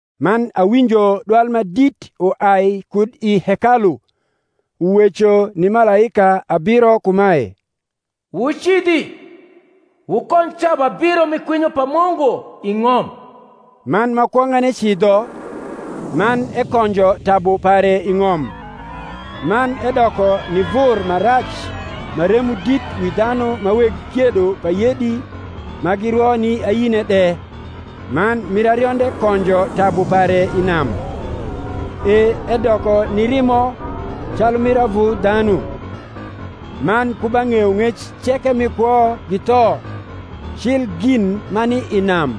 Man awinjo dwal ma dit uai kud i hekalu, uweco ni malaika abiro kumae, Wucidhi, wukonj tabu abiro mi kwinyo pa Mungu i ng’om. Man ma kwong’ane cidho, man ekonjo tabu pare i ng’om; man edoko ni vur ma rac ma remo dit wi dhanu ma weg kiedo pa yedi ma girwo ni ayine de. Man mir arionde konjo tabu pare i nam; e edoko ni rimo calu mir avu dhanu; man ku ba ng’eyong’ec ceke mi kwo githo, cil gin ma ni i nam.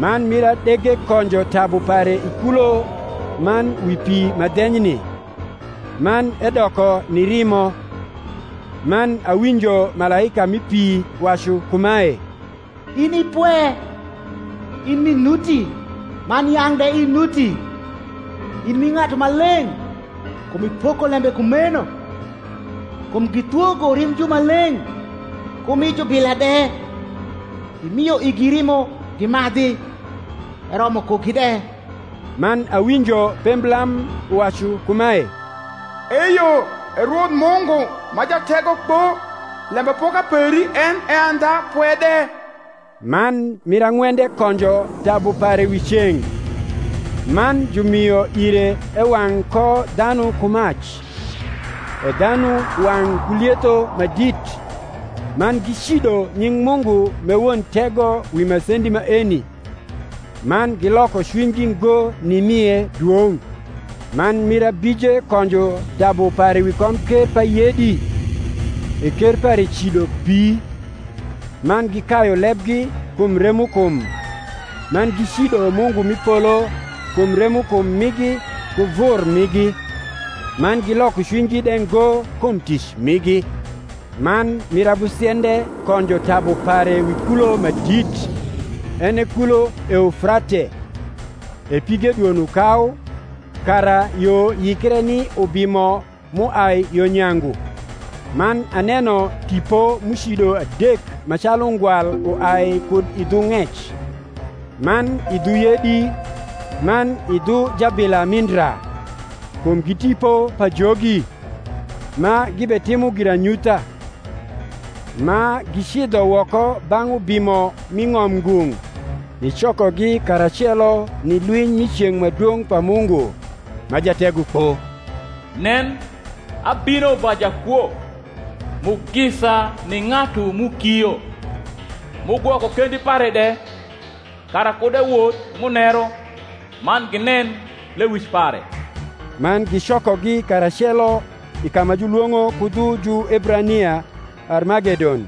Man mir adege konjo tabu pare i kulo man wi pi ma dhenyni; man edoko ni rimo. Man awinjo malaika mi pi wacu kumae, In i pwe, in m’i nuti man yang’ de inuti, in m’i Ng’atu Maleng’, kum ipoko lembe kumeno: kum githwogo rimb jumaleng’ ku mi jubila de, imio igi rimo gimadhi: eromo kugi de. Man awinjo pemblam uwacu kumae, Eyo, E Rwoth Mungu, ma Jategokpo, lembapoka peri en e andha pwe de. Man mir ang’wende konjo tabu pare wi ceng’; man jumio ire ewang’ ko dhanu ku mac. E dhanu wang’ ku lietho ma dit: man gicido nying’ Mungu m’e won tego wi masendi maeni; man giloko cwinygi ngo nimie dwong’. Man mir ahije konjo tabu pare wi komker pa yedi; e ker pare cido bii; man gikayu lebgi kum remokum, man gicido Mungu m’i polo kum remokum migi ku vur migi; man giloko cwinygi de ngo kum tic migi. Man mir abusiende konjo tabu pare wi kulo ma dit, en e kulo Eufrate; e pige dwono kau, kara yo yikre ni ubimo m’uai yo nyangu. Man aneno tipo m’ucido adek ma calu ungwal uai kud i dhu ng’ec, man i dhu yedi, man i dhu jabila mi ndra: kum gi tipo pajogi, ma gibetimo giranyutha; ma gicidho woko bang’ ubimo m’i ng’om ngung’, nicokogi karacelo ni lwiny mi ceng’ ma dwong’ pa Mungu, ma Jategokpo. (Nen, abino va jakwo. Mugisa ni ng’atu m’ukio, m’ugwoko kendi pare de, kara kud ewoth muneru, man ginen lewic pare.) Man gicokogi karacelo i ka ma julwong’o ku dhu Juebrania Armagedon.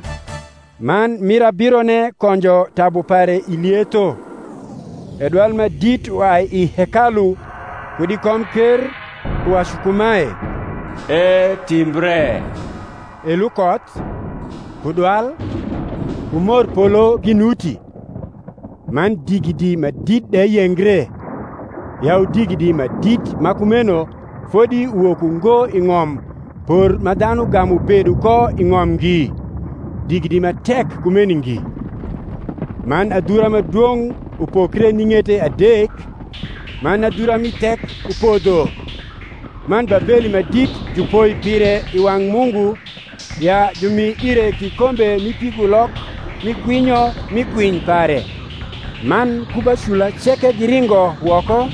Man mir abirone konjo tabu pare i lietho; e dwal ma dit uai i hekalu, kud i komker, uwacu kumae, Etimbre: e lukoth, ku dwal, ku morpolo ginuti; man digidi ma dit de yengre, yau digidi ma dit ma kumeno fodi uwok ungo i ng’om por ma dhanu gamu bedo ko i ng’om ngi, digidi ma tek kumeni ngi. Man adhura ma dwong’ upokre ni ng’ete adek, man adhura mi thek upodho; man Babeli ma dit jupoi pire i wang’ Mungu, ya jumi ire kikombe mi pigulok mi kwinyo mi kwiny pare. Man ku ba cula ceke giringo woko,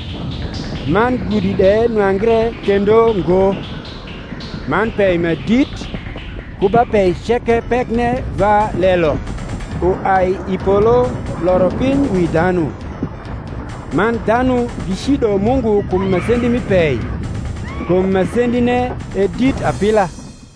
man gudi de nwangre kendo ngo. Man pei ma dit, ku ba pei ceke pekne va lelo, uai i polo loro piny wi dhanu: man dhanu gicido Mungu kum masendi mi pei; kum masendine e dit apila.